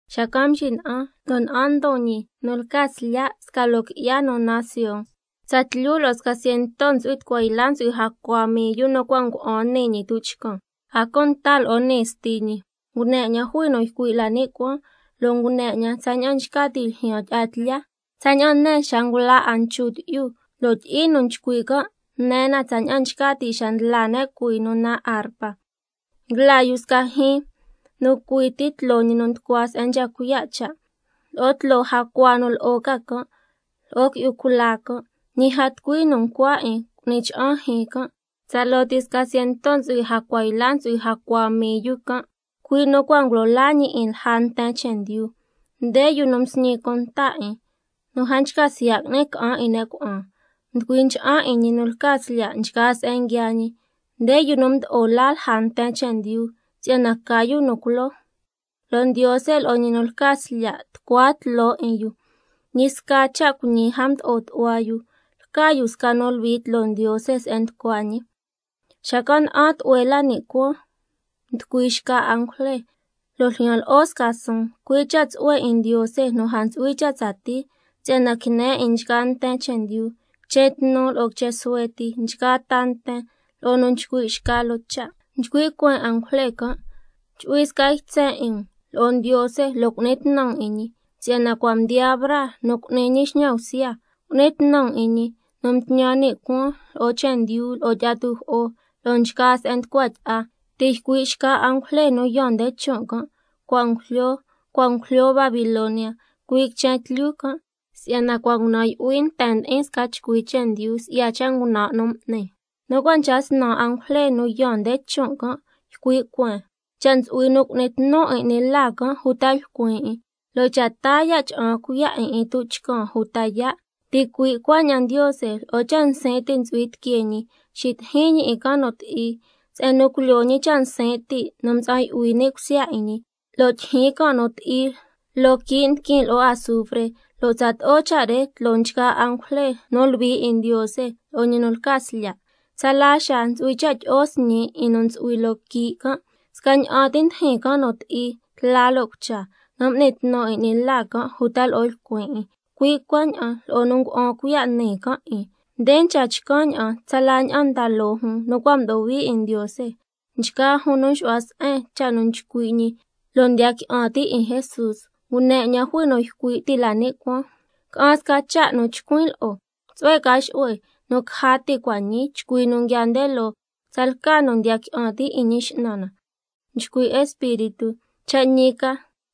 Xacan' mxina'an, lo' na'an ndon ñi nu lca Slya' sca loo qui'ya nu naan Sion, tsatlyu lo'o sca ciento ntsu'hui tucua yla ntsu'hui jacua mii yu nu cua' ngua'an nii ñi tuchcan, a cunta lo'o nii Sti ñi. Ngune 'ñan jui nu ycui' la ni' cuaan, lo' ngune na tsaña'an nchca ti' ljyaan tyi'a tlya, tsaña'an ne xa ngula 'a nchu tyi'yu, lo' tyi'i nu nchcui' can' ne na tsaña'an nchca ti' xa ndla ne' cuhuii nu naan arpa. Nguila yu sca jyiin nu cui ti tloo ñi nu nducua se'en nchca cuiya' cha', lo'o tloo jacua nu lo'o ca can', lo'o qui'yu cula can'. Ñi a tucui nu ncua 'in cu'ni cha'an jyiin can', tsaloo ti sca ciento ntsu'hui tucua yla ntsu'hui jacua mii yu can', cui' nu cua' ngulo laa ñi 'in lja ta nten chendyu. Nde yu nu nsñi cunta 'in, nu a nchca siya' qui'ni ca'an 'in ne' cuna'an. Nducui ncha'an 'in ñi nu lca Slya' nchgaa se'en nguiaa ñi. Nde yu nu mdo'o laa lja nten chendyu si'yana ca yu nu culoo, lo' Ndiose lo'o ñi nu lca Slya' tucua tloo 'in yu. Ñi sca cha' cuiñi a mdo'o tu'hua yu, lca yu sca nu luhui tloo Ndiose se'en nducua ñi. Xacan' na'an tlu'hue la ni' cuaan mducui xca angujle, lo' ljyan lo'o sca suun, cui' cha' tsu'hue 'in Ndiose nu a ntsu'hui cha' tsatii, si'yana quine 'in nchgaa nten chendyu, quichen tnu lo'o quichen suhue ti, nchgaa ta nten, lo'o nu nchcui' xca loo cha'. Nchcui' cueen angujle can': Chu'hui sca ytsen 'in um lo'o Ndiose lo' cu'ni tnu um 'in ñi, si'yana cua' mdiyaa braa nu cu'ni ñi xñan bsya. Cu'ni tnu um 'in ñi nu mtñan ni' cuaan lo'o chendyu, lo'o tyi'a tujo'o, lo'o nchgaa se'en nducua tyi'a. Ti' ycui' xca angujle nu yaan nde chon' can': —Cua' ngujlyo, cua' ngujlyo Babilonia, cui' quichen tlyu can'—, si'yana cua' ngunan' yu'hui nten ndi'in sca chcui chendyu si'ya cha' ngunan' nu m'ni. Nu cua' nchca snan angujle nu yaan nde chon' can' ycui' cueen: Cha' ntsu'hui nu cu'ni tnu 'in 'ni la can' uta lcuin 'in, lo' cha' taa ya' cha'an cuiya' 'in 'in tuchcan uta yaa', ticui' cuaña'an Ndiose lo'o cha' nsin' ti' ntsu'hui tiquee ñi xitijin ñi 'in can' nu ti'i, se'en nu culyoo ñi cha' nsin' ti' nu mtsa'an yu'hui ni' cusya 'in ñi, lo' tyijyin can' nu ti'i loo quii' ndiquin lo'o azufre, lo' tsato'o cha' re tloo nchgaa angujle nu luhui 'in Ndiose lo'o ñi nu lca Slya'. Tsala xaa ntsu'hui cha' tyi'o sñi 'in nu ntsu'hui loo quii' can', scaña'an ti ndijin can' nu ti'i tla lo' cucha, nu m'ni tnu 'in 'ni la can' uta lo'o lcuin 'in, cui' cuaña'an lo'o nu ngua'an cuiya' nii can' 'in. Nde nchca chcan' ña'an tsala ña'an nda loo jun nu cua' mdo'o hui 'in Ndiose, nchgaa jun nu nxu'hua se'en cha' nu nchcui' ñi lo' ndiya qui'an ti' 'in Jesús. Ngune 'ñan jui nu ycui' ti' la ni' cuaan: Ca'an sca cha' nu chcuin' lo'o: Tsu'hue ca xu'hue nu caja ti' cua' ñii chcui nu nguiaa nde loo, tsalca nu ndiya qui'an ti' 'in Ñi X'nan na. Nchcui' Espíritu: Cha' ñi ca,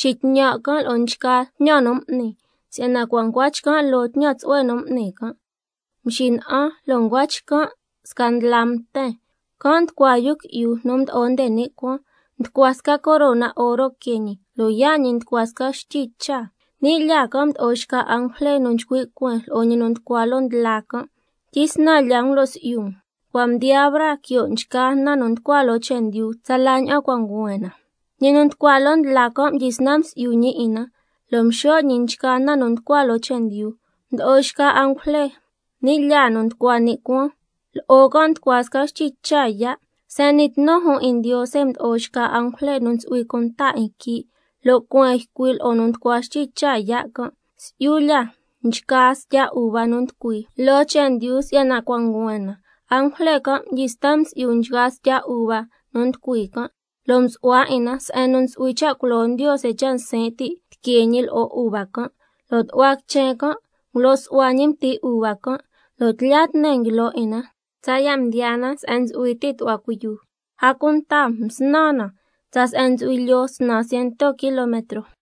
xitñan' can' lo'o nchgaa tñan nu m'ni, si'yana cua' ncua chcan' loo tñan tsu'hue nu m'ni can'. Mxina'an, lo' ncua chcan' sca ndla mten, can' nducua Yu Qui'yu nu Mdo'o nde ni' Cuaan, nducua sca corona oro quee ñi, lo' yaa' ñi nducua sca bxtyi cha. Ni' lyaa can' mdo'o xca angujle nu nchcui' cueen lo'o ñi nu nducua loo ndla can': Tyisnan lya um lo' si'yu um, cua' mdiyaa braa quio' nchgaa na nu nducua loo chendyu, tsala ña'an cua' nguhuen na. Ñi nu nducua loo ndla can' mdyisnan msi'yu ñi 'in na, lo' mxo' ñi nchgaa na nu nducua loo chendyu. Mdo'o xca angujle ni' lyaa nu nducua ni' cuaan can', lo'o can' nducua sca bxtyi cha yaa'. Se'en n'ni tnu jun 'in Ndiose mdo'o xca angujle nu ntsu'hui cunta 'in quii', lo' cueen ycui' lo'o nu nducua bxtyi cha yaa' can': Si'yu lya nchgaa stya uva nu nducui loo chendyu si'yana cua' nguhuen na. Angujle can' mdyisnan msi'yu nchgaa stya uva nu nducui can', lo' msu'hua 'in na se'en nu ntsu'hui cha' culo Ndiose cha' nsin' ti' tiquee ñi lo'o uva can'. La tu'hua quichen can' ngulo' su'hua ñi mti uva can', lo' tlya tne nguilo 'in na tsaya' mdiyaa na se'en ntsu'hui ti tu'hua cuiyu, a cunta msnan na tsa se'en ntsu'hui lyoo snan ciento kilometro.